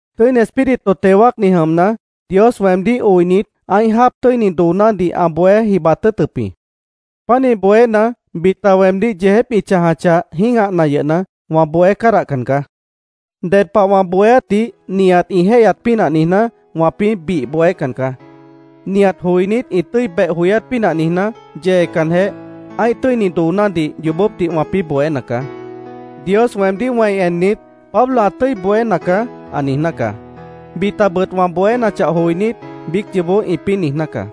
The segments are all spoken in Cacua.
Tʉ́ini Espíritu teo wáacni jʉmna, Dios weemdíh oinit, ã́ih jáap tʉ́ini doonádih ã bohé jibat tʉ́ʉtʉp jĩ. Pánih bohéna, bita weemdíh yeejép ĩ chãjachah, jĩ́gahna yʉhna, wã bohé cádahcan caá. Ded pah wã bohéátdih nihat ĩ jéihyat pínah niijná, wãpĩ́ bih bohécan caá. Nihat joinít ĩ tʉ́i beh joyát pínah niijná, yeecanjeh, ã́ih tʉ́ini doonádih yoobópdih wãpĩ́ bohéna caá. Dios weemdíh wẽi ennit, “Pablo ã tʉ́i bohéna caá”, ã niijná caá. Bitabʉt wã bohénachah joinít, biíc yoobó ĩpĩ́ niijná caá.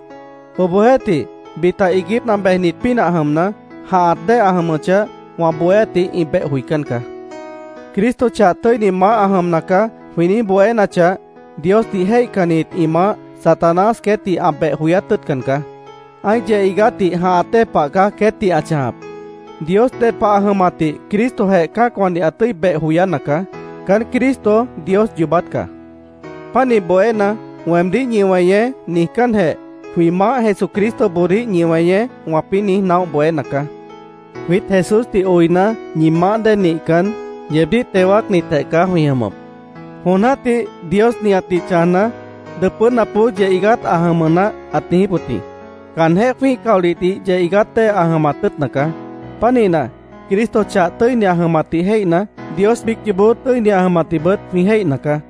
Obohjeéhtih, bita iiguípna bejnit pínah jʉmna, jãhat dée ã jʉmʉchah, wã bohéátdih ĩ beh joicán caá. “Cristo chah tʉ́ini Maáh ã jʉmna caá”, jwĩ niíj bohénachah, Diosdih jéihcannit ĩ maáh, Satanás queétdih ã beh joyát tʉ́ʉtcan caá. Ã́ih yeh iigátdih jãhat dée pah caá queétdih ã chãjap. Dios ded pah ã jʉmatdih Cristojeh cã́acwãdih ã tʉ́i beh joyána caá. Caán Cristo Dios yoobát caá. Pánih bohéna, “Weemdíh ñi weñeé”, niijcánjeh, “Jwĩ Maáh Jesucristoboodíh ñi weñeé”, wãpĩ́ niíj naóh bohéna caá. Jwiít Jesúsdih oina, ñi maáh dée nihcan, yeebdíh teo wáacnitjeh caá jwĩ jʉmʉp. Jon jã́tih Dios nihatdih chãjna, “Dʉpʉ́napboó yeh iigát ã jʉmʉ naáh”, ãt niijíp wʉt jĩ. Caanjéh jwĩ́ih caolihdih yeh iigát dée ã jʉmat tʉ́ʉtna caá. Pánihna, Cristo, chah tʉ́ini ã jʉmatdih jéihna, Dios biíc yoobó tʉ́ini ã jʉmatdihbʉt jwĩ jéihna caá.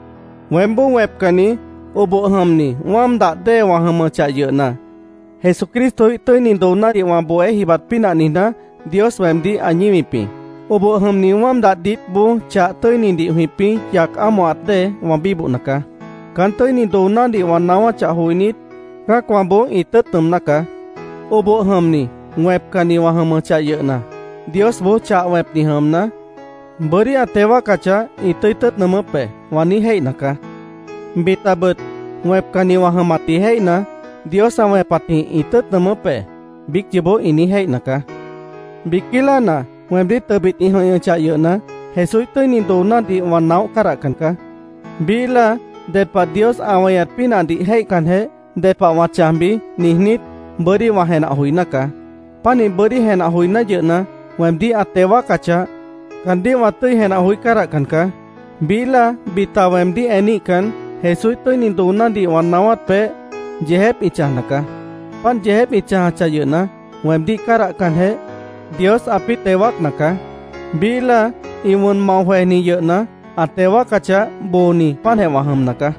Weémboó wẽpcanni, oboh jʉmni wáam dah dée wã jʉmʉchah yʉhna, Jesucristoíh tʉ́ini doonádih wã bohé jibat pínah niijná, Dios weemdíh ã ñíwip jĩ. Oboh jʉmni wáam dah diítboó chah tʉ́inidih jwĩpĩ́ yac ámohat dée wã bíbohna caá. Caán tʉ́ini doonádih wã naáwáchah joinít, cã́acwãboó ĩ tʉ́ʉt nʉʉmná caá. “Oboh jʉmni, wẽpcanni wã jʉmʉchah yʉhna, Diosboó chah wẽpni jʉmna, bʉ́dí ã teo wáacachah, ĩ tʉ́i tʉ́ʉt nʉʉmʉ́p be”, wã niíj jéihna caá. Bitabʉt, wẽpcanni wã jʉmatdih jéihna, “Dios ã wẽpatjĩh ĩ tʉ́ʉt nʉʉmʉ́p be”, biíc yoobó ĩ niíj jéihna caá. Biquí láana weemdíh tʉbit ĩ jʉ̃ihñʉchah yʉhna, Jesúíh tʉ́ini doonádih wã naóh cádahcan caá. Biíh láa ded pah Dios ã weñat pínahdih jéihcanjeh, “¿ded pah wã chãjbi?” niijnít, bʉ́dí wã jenah joiná caá. Pánih bʉ́dí jenah joiná yʉhna, weemdíh ã teo wáacachah, caandíh wã tʉ́i jenah joí cádahcan caá. Biíh láa bita weemdíh eníhcan, Jesúíh tʉ́ini doonádih wã naáwát peéh, yeejép ĩ chãjna caá. Páant yeejép ĩ chãjachah yʉhna, weemdíh cádahcanjeh, Dios ãpĩ́ teo wáacna caá. Biíh láa ĩ wʉn mao jwejni yʉhna, ã teo wáacachah, booni páantjeh wã jʉmna caá.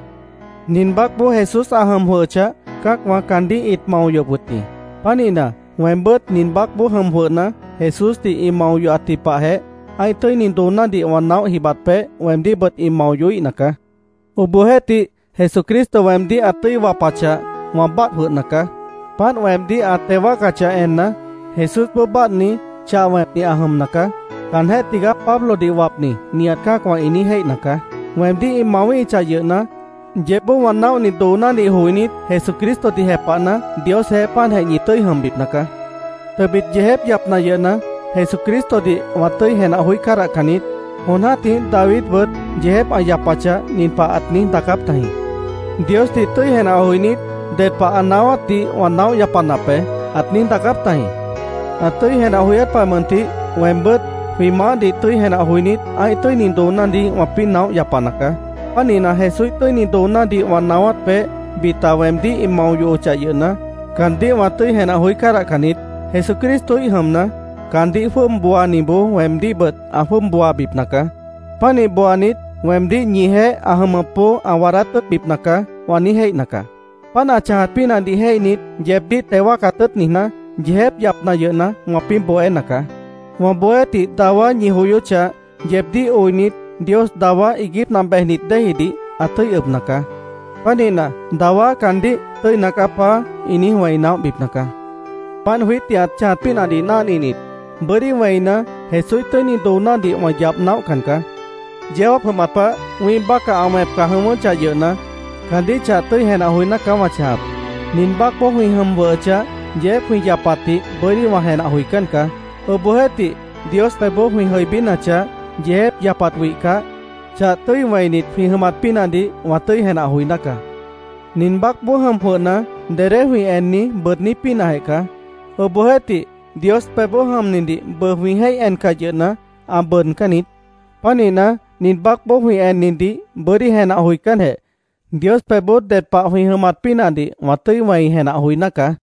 Nin baácboó Jesús ã jʉm jwʉhʉchah, cã́acwã caandíh ĩt mao yohop wʉt jĩ. Pánihna, weembʉ́t nin baácboó jʉm jwʉhna, Jesúsdih ĩ mao yohatji pahjeh, ã́ih tʉ́ini doonádih wã naóh jibat peéh, weemdíhbʉt ĩ mao yohíhna caá. Obohjeéhtih, Jesucristo weemdíh ã tʉ́i wapachah, wã báadh jwʉhna caá. Páant weemdíh ã teo wáacachah enna, “Jesúsboó báadhni, chah wẽpni ã jʉmna caá. Caanjéh tigaá Pablodih wapni”, nihat cã́acwã ĩ niíj jéihna caá. Weemdíh ĩ mawíhichah yʉhna, yeébboó wã naóhni doonádih joinít, Jesucristodih jepahna, Diosjeéh páantjeh ñi tʉ́i jʉmbipna caá. Tʉbit yeejép yapna yʉhna, Jesucristodih wã tʉ́i jenah joí cádahcan niít. Jon jã́tih Davidbʉt yeejép ã yapachah, nin pah ãt niíj daacáp tajĩ: “Diosdih tʉ́i jenah joinít, ded pah ã naáwátdih wã naóh yapanap be”, ãt niíj daacáp tajĩ. Ã tʉ́i jenah joyát pah mʉntih weembʉ́t jwĩ Maáhdih tʉ́i jenah joinít, ã́ih tʉ́ini doonádih wãpĩ́ naóh yapana caá. Pánihna, Jesúíh tʉ́ini doonádih wã naáwát peéh bita weemdíh ĩ mao yohochah yʉhna, caandíh wã tʉ́i jenah joí cádahcan niít. “Jesucristoíh jʉmna, caandíh jwʉ́ʉb booaniboó weemdíhbʉt ã jwʉ́ʉb booabipna caá. Pánih booanit, weemdíh ñijeéh ã jʉmʉpboó ã waadát tʉ́ʉtbipna caá”, wã niíj jéihna caá. Páant ã chãjat pínahdih jéihnit, yeebdíh teo wáacat tʉ́ʉt niijná, yeejép yapna yʉhna, wãpĩ́ bohéna caá. Wã bohéátdih dawá ñi joyóchah, yeebdíh oinit, Dios dawá iiguípna bejnit déejidih ã tʉ́i ʉbna caá. Pánihna, dawá caandíh “Tʉ́ina caá, Paá”, ĩ niíj wẽi naóhbipna caá. Páant jwiítdih ã chãjat pínahdih náhninit, bʉ́dí wẽina, Jesúíh tʉ́ini doonádih wã yabh naóhcan caá. Yeó jáap jʉmat pah wĩ́ih bácah ã wẽpca jʉ̃ʉ́wʉ́chah yʉhna, caandíh chah tʉ́i jenah joiná caá wã chãjap. Nin baácboó jwĩ jʉm jwʉhʉchah, yeejép jwĩ yapatdih bʉ́dí wã jenah joicán caá. Obohjeéhtih, Dios pebhboó jwĩ jʉibínachah, yeejép yapat wihcah, chah tʉ́i wẽinit jwĩ jʉmat pínahdih wã tʉ́i jenah joiná caá. Nin baácboó jʉm jwʉhna, dedé jwĩ enni bʉʉdní pínahjeh caá. Obohjeéhtih, Dios pebhboó jʉmnidih bʉʉ jwĩ jéih encah yʉhna, ã bʉʉdcán niít. Pánihna, nin baácboó jwĩ ennidih bʉ́dí jenah joicánjeh, Dios pebhboó ded pah jwĩ jʉmat pínahdih wã tʉ́i wẽi jenah joiná caá.